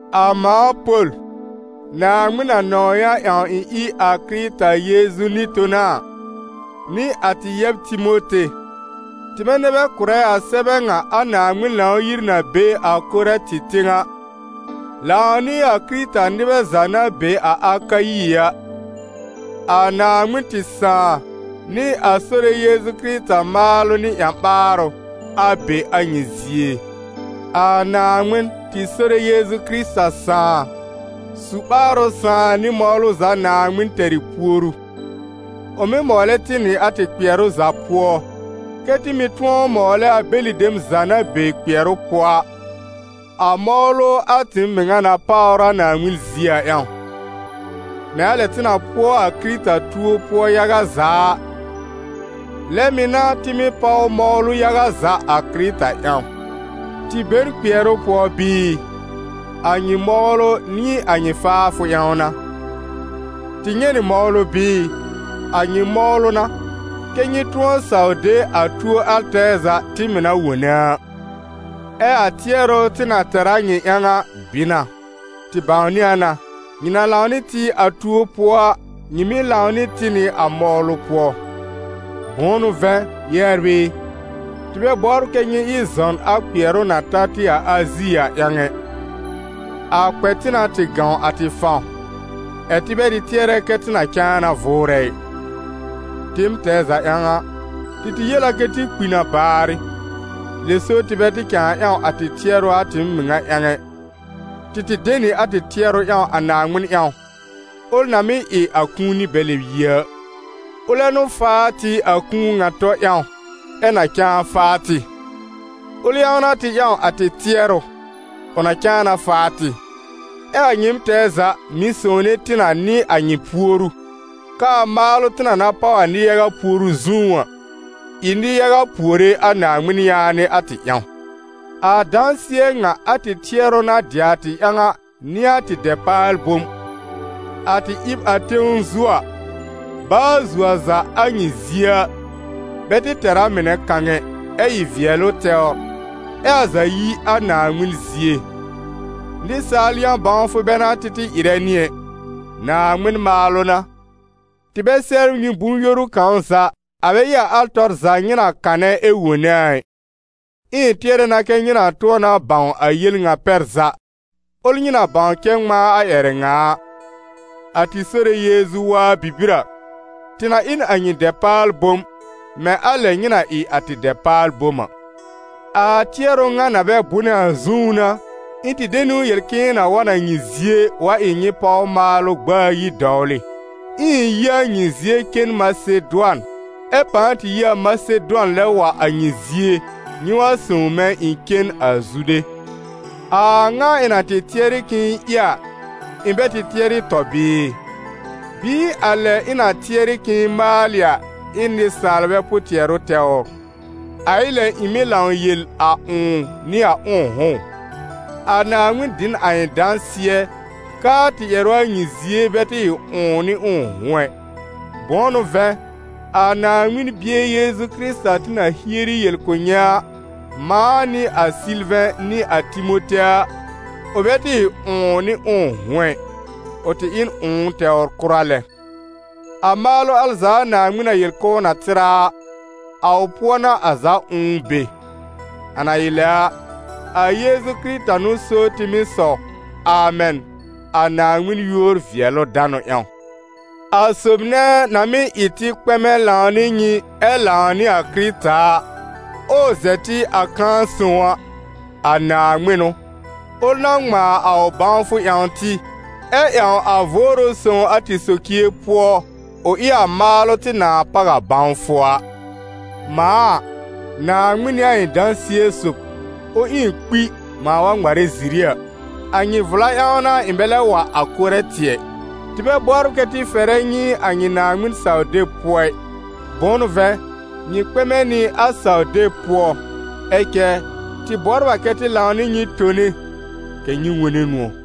A mãa Pol, Naaŋmɩn na nɔ̃w yã ƴãw ɩ̃ ɩ a Kɩrɩta Yeezu nɩ-tona a, nɩ a tɩ yɛb Timote, tɩmɛ nɛ bɛ kʋ̀rɛ a sɛbɛ ŋa a Naaŋmɩn Lãw-yir na be a Korɛ̃tɩ tẽw a, lãw nɩ a Kɩrɩta-nɩbɛ za na be a Akayi a. A Naaŋmɩn tɩ Sãà nɩ a Sore Yeezu Kɩrɩta maalʋ nɩ ƴã-ɓaarʋ, a be a nyɩ zie. A Naaŋmɩn, tɩ Sore Yeezu Kɩrɩta Sãà, su-ɓaarʋ Sãà nɩ mɔwlʋ za Naaŋmɩn tɛr ɩ puoru. Ʋ mɩ́ mɔwlɛ tɩ nɩ a tɩ kpɩɛrʋ za pʋɔ, kɛ́ tɩ mɩ̀ tʋ̃ɔ mɔwlɛ a bɛlɩ dem za na be kpɩɛrʋ pʋɔ a, a mɔwlʋ a tɩɩm mɩŋa na páwr a Naaŋmɩn zie a ƴãw. Mɛ̃ a lɛ tɩ na pʋɔ a Kɩrɩta tuo pʋɔ yaga za a, lɛ mɩ̀ n'a tɩ mɩ́ páw mɔwlʋ yaga za a Kɩrɩta ƴãw. Tɩ be n kpɩɛrʋ pʋɔ bɩɩ? A nyɩ mɔwlʋ nɩ a nyɩ faafʋ ƴãw n'a. Tɩ nyɛ̃ nɩ mɔwlʋ bɩɩ? A nyɩ mɔwlʋ n'a, kɛ́ nyɩ tʋ̃ɔ saw de a tuo al tɛɛ za tɩ mɩ̀ na wone a. Ɛ a tɩɛrʋ tɩ na tɛr a nyɩ ƴãw a bɩ na; tɩ bãwnɩ a na: nyɩ na lãw nɩ tɩ a tuo pʋɔ a, nyɩ mɩ̀ lãw nɩ tɩ nɩ a mɔwlʋ pʋɔ. Bʋ̃ʋ n'ʋ vɛ̃, yɛbr ɩ, tɩ bɛ bɔbr kɛ́ nyɩ ɩ zɔn a kpɩɛrʋ na ta tɩ a Azi a ƴãw ɛ: a kpɛ tɩ na tɩ gãw a tɩ fãw, ɛ̀ tɩ bɛ tɩ tɩɛrɛ kɛ tɩ na cãa na vʋʋrɛ ɩ. Tɩɩm tɛɛ za ƴãw a, tɩ tɩ yel a kɛ tɩ kpi na baarɩ, lɛ so tɩ bɛ tɩ cãa ƴãw a tɩ tɩɛrʋ a tɩɩm mɩŋa ƴãw ɛ, tɩ tɩ de nɩ a tɩ tɩɛrʋ ƴãw a Naaŋmɩn ƴãw, ʋl na mɩ́ ɩ a kũuni bɛ lɛb yi a. Ʋlɛ n'ʋ faa tɩ a kũu ŋa tɔ ƴãw, ɛ na cãa faa tɩ; ʋl ƴãw n'a tɩ ƴãw a tɩ tɩɛrʋ, ʋ na cãa na faa tɩ. Ɛ a nyɩɩm tɛɛ za mɩ̀ sõwne tɩ na nɩ a nyɩ puoru, k'aa maalʋ tɩ na na páw a nɩ-yaga puoru zũú a, ɩ nɩ-yaga puore a Naaŋmɩn yaanɩ a tɩ ƴãw. A dãsɩɛ ŋa a tɩ tɩɛrʋ na dɩ a tɩ ƴãw a n'ɩ a tɩ dɛpaal-bom: a tɩ ɩb a tẽw zu a, baa zuo a za a nyɩ zie a, bɛ tɩ tɛr a mɩnɛ kãw ɛ, ɛ ɩ vɩɛlʋ tɛwr, ɛ a za yi a Naaŋmɩn zie; nɩsaal yã-bãwfʋ bɛ n'a tɩ tɩ ɩrɛ nɩ ɛ, Naaŋmɩn maalʋ n'a. Tɩ bɛ sɛbr nyɩ bʋ̃-yoru kãw za, a bɛ ɩ a al tɔr za nyɩ na kanɛ ɛ wone a ɩ. Ɛ ɩ̃ tɩɛrɛ na kɛ́ nyɩ na tʋ̃ɔ na bãw a yel ŋa pɛr za, ʋl nyɩ na bãw cɛ ŋmãa a ƴɛrɛ ŋa a: a tɩ Sore Yeezu waa bibir a, tɩ na ɩ n a nyɩ dɛpaal-bom, mɛ̃ a lɛ nyɩ na ɩ a tɩ dɛpaal-bom a. A tɩɛrʋ ŋa na bɛ bʋnɛ a zũú n'a, ɩ̃ tɩ de niwn yel k'ɩ̃ɩ na wa n a nyɩ zie wa ɩ nyɩ páw maalʋ gb'aa ayi dɔwlɩ, ɛ ɩ̃ yi a nyɩ zie cen Masedʋan, ɛ pãa tɩ yi a Masedʋan lɛb wa a nyɩ zie, nyɩ wa sõw mɛ̃ ɩ̃ cen a Zude. A a ŋa ɩ̃ na tɩ tɩɛr k'ɩ̃ɩ ɩ a, ɩ̃ bɛ tɩ tɩɛrɩ tɔ bɩɩ? Bɩɩ a lɛ ɩ̃ na tɩɛrɩ k'ɩ̃ɩ maalɩ a, ɩ n nɩsaalbɛ pʋ-tɩɛrʋ tɛwr? A ɩ lɛ ɩ̃ mɩ́ lãw yel a «ʋ̃ʋ» nɩ a «ʋ̃ʋ'hʋ̃» ʋ? A Naaŋmɩn dɩ n a ɩ̃ dãsɩɛ k'aa tɩ ƴɛrʋ a nyɩ zie bɛ tɩ ɩ «ʋ̃ʋ» nɩ «ʋ̃ʋ'hʋ̃» ɛ. Bʋ̃ʋ n'ʋ vɛ̃, a Naaŋmɩn Bie Yeezu Kɩrɩta tɩ na hieri yel kʋ̀ nyɩ a, mãa nɩ a Sɩlvɛ̃ nɩ a Timote a, ʋ bɛ tɩ ɩ «ʋ̃ʋ» nɩ «ʋ̃ʋ'hʋ̃» ɛ, ʋ tɩ ɩ n «ʋ̃ʋ» tɛwr kʋra lɛ. A maalʋ al za a Naaŋmɩn na yel k'ʋʋ na tɩr a a, a ʋ pʋɔ n'a a za «ʋ̃ʋ» be. A na ɩ lɛ a, a Yeezu Kɩrɩta n'ʋ so tɩ mɩ́ sɔw «Amɛn», a Naaŋmɩn yúor-vɩɛlʋ-danʋ ƴãw. A sob nɛ na mɩ́ ɩ tɩ kpɛmɛ lãw nɩ nyɩ ɛ lãw nɩ a Kɩrɩta a, ɛ ʋ zɛ tɩ a kãa sõw a, a Naaŋmɩn n'ʋ, ʋl na ŋmãa a ʋ bãwfʋ ƴãw tɩ, ɛ ƴãw a Vʋʋrʋ Sõw a tɩ socie pʋɔ, ʋ ɩ a maalʋ tɩ nãa páw a bãwfʋ a. Mãa a, Naaŋmɩn n'ɩ a ɩ̃ dãsɩɛ sob, ʋ ɩ ɩ̃ kpi mãa wa ŋmarɛ ziri a: a nyɩ vla ƴãw n'a ɩ̃ bɛ lɛb wa a Korɛ̃tɩ ɛ. Tɩ bɛ bɔbr kɛ tɩ fɛrɛ nyɩ a nyɩ Naaŋmɩn saw-deb pʋɔ ɩ, bʋ̃ʋ n'ʋ vɛ̃, nyɩ kpɛmɛ nɩ a saw-deb pʋɔ; ɛ cɛ tɩ bɔbr a kɛ tɩ lãw nɩ nyɩ tone kɛ̀ nyɩ wone nʋ̃ɔ̀.